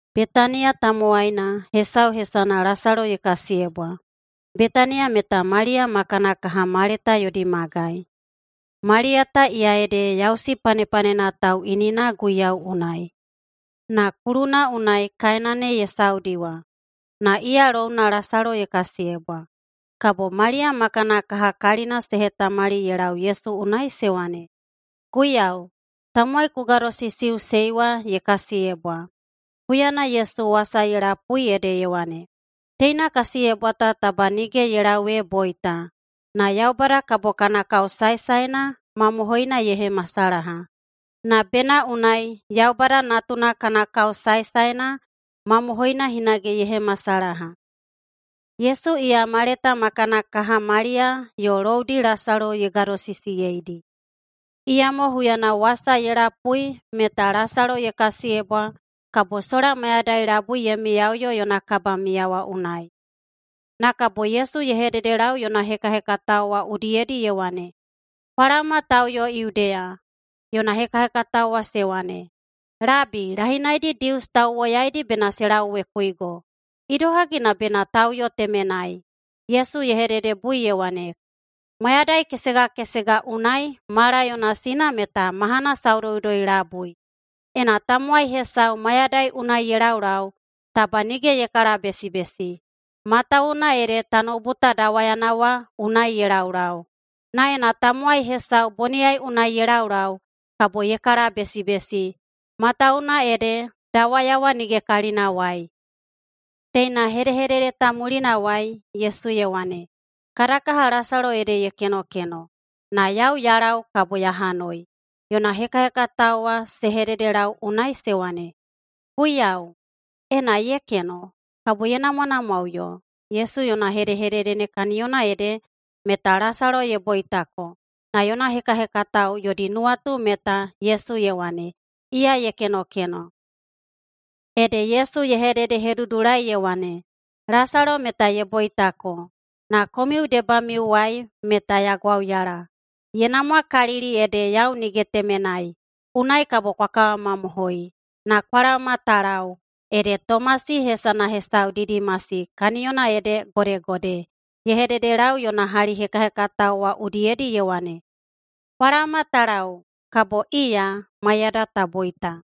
Betaniya tamowaina hesau hesana Lasalo ye kasiyebwa. Betaniya meta Maliya ma kana kaha Maleta yodi magai. Maliya ta iya ede yausi panepanena tauꞌinina Guiyau unai, na kuluna unai kaena ne ye saudi wa. Na iya louna Lasalo ye kasiyebwa. Kabo Maliya ma kana kaha kalina se hetamali ye lau Yesu unai se wane, “Guiyau, tamowai ku gadosisiꞌusei wa ye kasiyebwa.” Huyana Yesu wasa wa ye lapui ede ye wane, “Teina kasiyebwa ta taba nige ye lau ee boita, na Yaubada kabo kana kao saesaena mamohoina ye hemasalaha, na bena unai Yaubada Natuna kana kao saesaena mamohoina hinage ye hemasalaha.” Yesu iya Maleta ma kana kaha Maliya yo loudi Lasalo ye gadosisiyeidi. Iyamo huyana wasa ye lapui meta Lasalo ye kasiyebwa kabo sola mayadai labui ye miyaꞌuyo yona kabamiya wa unai. Na kabo Yesu ye hededelau yona hekahekatao wa udiyedi ye wane, “Kwa laoma ta uyo Yudeya.” Yona hekahekatao wa se wane, “Labi, lahinaidi Dius tauwoyaidi bena se lauwekuigo. Idohagi na bena ta uyo temenai?” Yesu ye hededebui ye wane, “Mayadai kesega kesega unai mala yona sina meta mahana saudoudoi-labui. Ena tamowai hesau mayadai unai ye laulau, taba nige ye kalabesibesi, matawuwuna ede tanoubu ta dawayana wa unai ye laulau. Na ena tamowai hesau boniyai unai ye laulau kabo ye kalabesibesi, matawuwuna ede dawaya wa nige kalinawai.” Teina hedehedede ta mulinawai Yesu ye wane, “Kada kaha Lasalo ede ye kenokeno, na yau ya lau kabo ya hanoi.” Yona hekahekatao wa se hededelau unai se wane, “Guiyau, ena ye keno, kabo ye namwanamwaꞌuyo.” Yesu yona hedehedede ne kaniyona ede, meta Lasalo ye boitako, na yona hekahekatao yodi nuwatu meta Yesu ye wane, iya ye kenokeno. Ede Yesu ye hededehedudulai ye wane, “Lasalo meta ye boitako. Na komiu debamiuwai meta ya gwauyala. Ye namwakalili ede yau nige temenai. Unai kabo kwa kawamamohoi. Na kwa laoma ta lau.” Ede Tomasi (hesana hesau Didimasi, [kaniyona ede godegode]) ye hededelau yona hali hekahekatao wa udiyedi ye wane, “Kwa laoma ta lau, kabo iya maiyada ta boita.”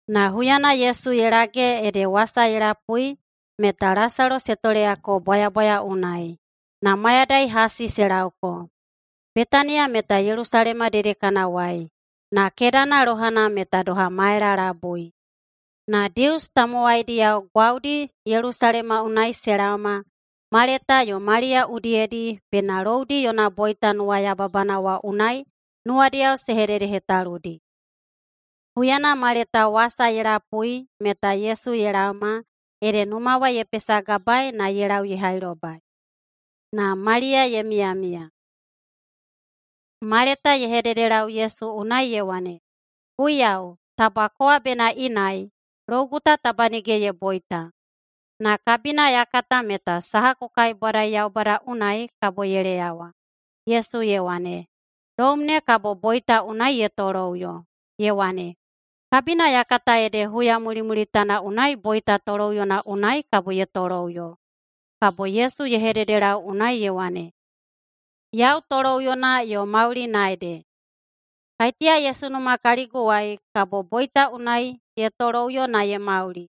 Na huyana Yesu ye lage ede wasa ye lapui meta Lasalo se toleyako bwayabwaya unai, na mayadai hasi se laoko. Betaniya meta Yelusalema dedekanawai, na kedana lohana meta doha maela labui. Na Dius tamowaidiyao gwaudi Yelusalema unai se laoma Maleta yo Maliya udiyedi bena loudi yona boita nuwayababana wa unai nuwadiyao se hededehetaludi. Huyana Maleta wasa ye lapui meta Yesu ye laoma, ede numa wa ye pesagabaei na ye lau ye hailobai, na Maliya ye miyamiya. Maleta ye hededelau Yesu unai ye wane, “Guiyau, taba kowa bena inai, lougu ta taba nige ye boita. Na kabina ya kata meta saha ku kaibwadai Yaubada unai, kabo ye leyawa.” Yesu ye wane, “Loum ne kabo boita unai ye toloꞌuyo.” Ye wane, “Kabina ya kata ede huya mulimulitana unai boita toloꞌuyona unai kabo ye toloꞌuyo.” Kabo Yesu ye hededelau unai ye wane, “Yau toloꞌuyona yo maulina ede. Kaiteya ye sunuma kaliguwai, kabo boita unai ye toloꞌuyo na ye mauli.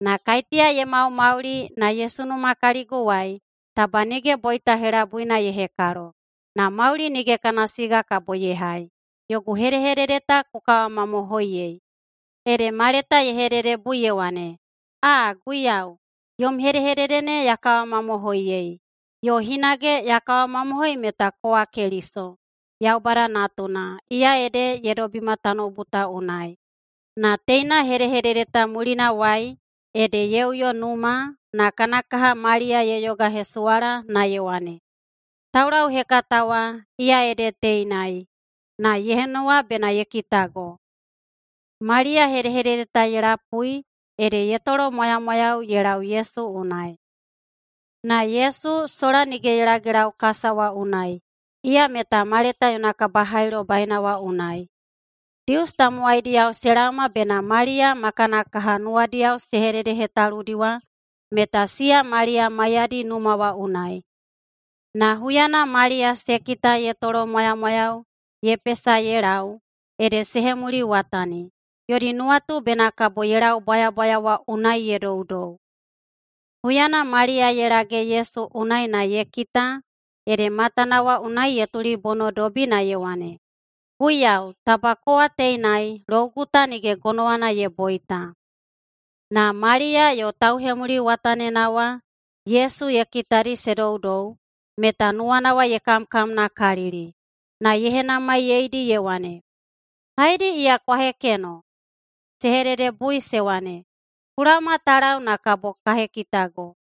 Na kaiteya ye maumauli na ye sunuma kaliguwai, taba nige boita helabuina ye hekalo, na mauli nige kana siga kabo ye hai. Yogu hedehedede ta ku kawamamohoiyei?” Ede Maleta ye hededebui ye wane, “Aa! Guiyau, [yom hedehedede ne ya kawamamohoiyei. Yo hinage] ya kawamamohoi meta kowa Keliso, Yaubada Natuna, iya ede ye dobima tanoubu ta unai.” Na teina hedehedede ta mulinawai ede ye uyo numa na kana kaha Maliya ye yogahesuwala na ye wane, “Taulauhekata wa, iya ede teinai na ye henuwa bena ye kitago.” Maliya hedehedede ta ye lapui ede ye tolomwayamwayau ye lau Yesu unai. Na Yesu sola nige ye lagelau kasa wa unai, iya meta Maleta yona kabahailobaina wa unai. Dius tamowaidiyao se laoma bena Maliya ma kana kaha nuwadiyao se hededehetaludi wa, meta siya Maliya maiyadi numa wa unai. Na huyana Maliya se kita ye tolomwayamwayau ye pesa ye lau, ede se hemuliwatani. Yodi nuwatu bena kabo ye lau bwayabwaya wa unai ye doudou. Huyana Maliya ye lage Yesu unai na ye kita, ede matana wa unai ye tulibonodobi na ye wane, “Guiyau, taba kowa teinai, lougu ta nige gonowana ye boita.” Na Maliya yo tauhemuliwatanina wa Yesu ye kitadi se doudou, meta nuwana ye kamkamnakalili, na ye henamaiyeidi ye wane, “Haedi iya kwa hekeno?” Se hededebui se wane, “Ku laoma ta lau na kabo ka hekitago.”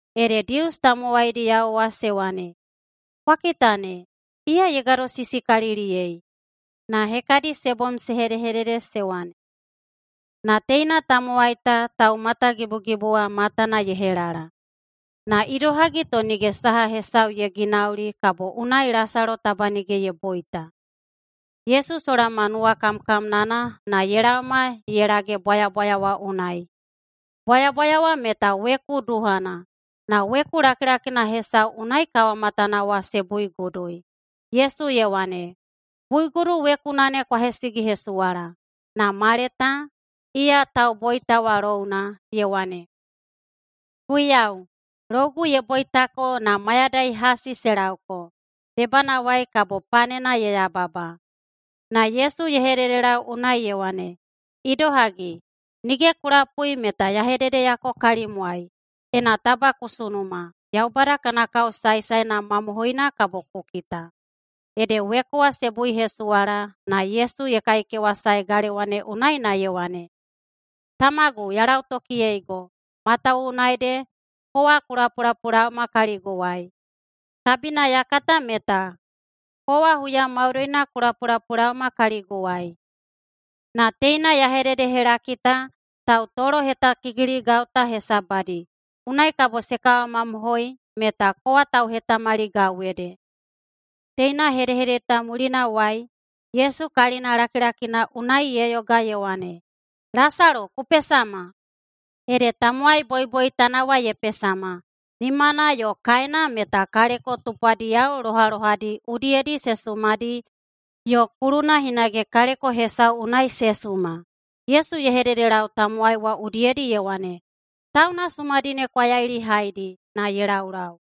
Ede Dius tamowaidiyao wa se wane, “Kwa kita ne, iya ye gadosisikaliliyei.” Na hekadi se bom se hedehedede se wane, “Na teina tamowai ta taumatagibugibu wa matana ye helala. Na idohagi to nige saha hesau ye ginauli kabo unai Lasalo taba nige ye boita?” Yesu sola ma nuwakamkamnana na ye laoma ye lage bwayabwaya wa unai. Bwayabwaya wa meta weku duhana, na weku lakilakina hesau unai kawamatana wa se buigudui. Yesu ye wane, “Buigudu wekuna ne kwa hesigihesuwala.” Na Maleta, iya tauboita wa louna, ye wane, “Guiyau, lougu ye boitako na mayadai hasi se laoko, debanawai kabo panena ye yababa.” Na Yesu ye hededelau unai ye wane, “Idohagi, nige ku lapui meta ya hededeyako kalimwai, ena taba ku sunuma, Yaubada kana kao saesaena mamohoina kabo ku kita.” Ede weku wa se buihesuwala, na Yesu ye kaikewasae galewa ne na ye wane, “Tamagu, ya lautokiyeigo, matawuwuna ede kowa ku lapulapulaoma kaliguwai. Kabina ya kata meta kowa huya maudoina ku lapulapulaoma kaliguwai, na teina ya hededehelaki ta tautolohetakikiligau ta hesabadi, unai kabo se kawamamohoi meta kowa tauhetamaligau ede.” Teina hedehedede ta mulinawai Yesu kalinalakilakina unai ye yoga ye wane, “Lasalo, ku pesama!” Ede tamowai boiboitana wa ye pesama, nimana yo kaena meta kaleko tupwadiyao lohalohadi udiyedi se sumadi yo kuluna hinage kaleko hesau unai se suma. Yesu ye hededelau tamowai wa udiyedi ye wane, “Tauna sumadi ne kwa yailihaidi na ye laulau.”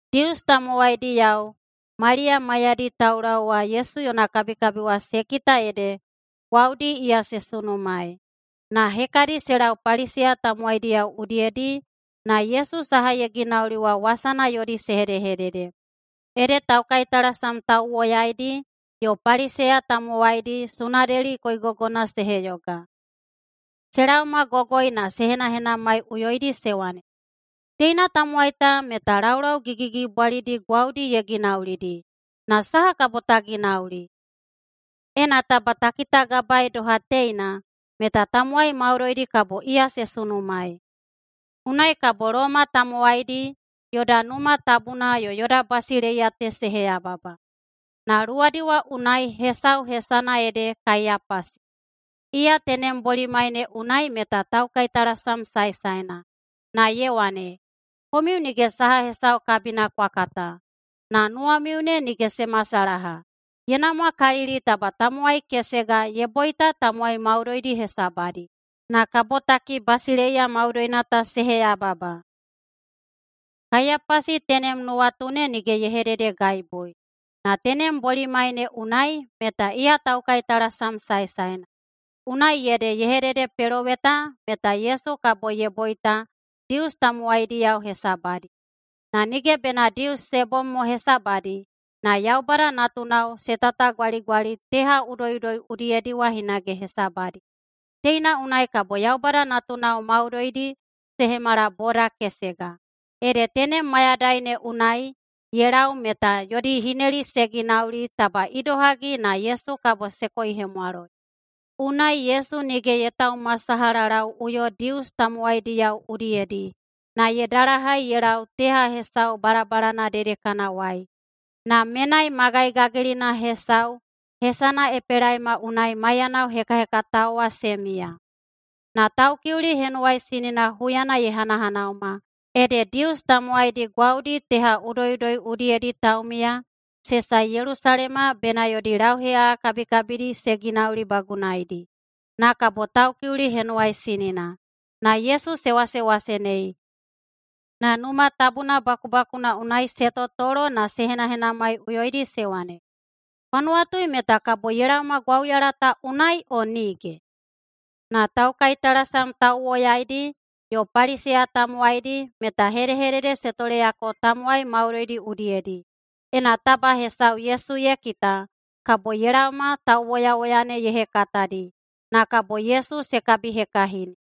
Dius tamowaidiyao Maliya maiyadi taulau wa Yesu yona kabikabi wa se kita ede gwaudi iya se sunumaei. Na hekadi se lau Paliseya tamowaidiyao udiyedi, na Yesu saha ye ginauli wa wasana yodi se hedehedede. Ede taukaitalasam tauwoyaidi yo Paliseya tamowaidi Sunedeli koigogona se heyoga. Se laomagogoi na se henahenamaiꞌuyoidi se wane, “Teina tamowai ta meta laulau gigigigibwalidi gwaudi ye ginaulidi. Na saha kabo ta ginauli? Ena taba ta kitagabaei doha teina meta tamowai maudoidi kabo iya se sunumaei. Unai kabo Loma tamowaidi yoda Numa Tabuna yo yoda basileiya ta se heyababa.” Na luwadi wa unai hesau hesana ede Kaiyapasi, iya tenem bolimai ne unai meta taukaitalasam saesaena, na ye wane, “Komiu nige saha hesau kabina kwa kata. Na nuwamiu ne nige se masalaha. Ye namwakalili taba tamowai kesega ye boita tamowai maudoidi hesabadi, na kabotaki basileiya maudoina ta se heyababa.” Kaiyapasi tenem nuwatu ne nige ye hededegaibui, na tenem bolimai ne unai meta iya taukaitalasam saesaena, unai ede ye hededepeloweta meta Yesu kabo ye boita Dius tamowaidiyao hesabadi. Na nige bena Dius se bom hesabadi, na Yaubada natunao se tatagwaligwali teha udoiꞌudoi udiyedi wa hinage hesabadi. Teina unai kabo Yaubada natunao maudoidi se hemala boda kesega. Ede tenem mayadai ne unai ye lau meta yodi hineli se ginauli taba idohagi na Yesu kabo se koihemwaloi. Unai Yesu nige ye taumasalahalauꞌuyo Dius tamowaidiyao udiyedi, na ye dalahai ye lau teha hesau balabalana dedekanawai, na menai magai gagilina hesau hesana Epelaima unai maiyanao hekahekatao wa se miya. Na Taukiuli Henuwaisinina huyana ye hanahanauma, ede Dius tamowaidi gwaudi teha udoiꞌudoi udiyedi taumiya se sae Yelusalema bena yodi lauheꞌaꞌa kabikabidi se ginaulibagunaidi, na kabo Taukiuli Henuwaisinina. Na Yesu se wasewasenei, na Numa Tabuna bakubakuna unai se totolo na se henahenamaiꞌuyoidi se wane, “Kwa nuwatui meta kabo ye laoma gwauyala ta unai, o nige?” Na taukaitalasam tauwoyaidi yo Paliseya tamowaidi meta hedehedede se toleyako tamowai maudoidi udiyedi, ena taba hesau Yesu ye kita, kabo ye laoma tauwoyawoya ne ye hekatadi, na kabo Yesu se kabihekahini.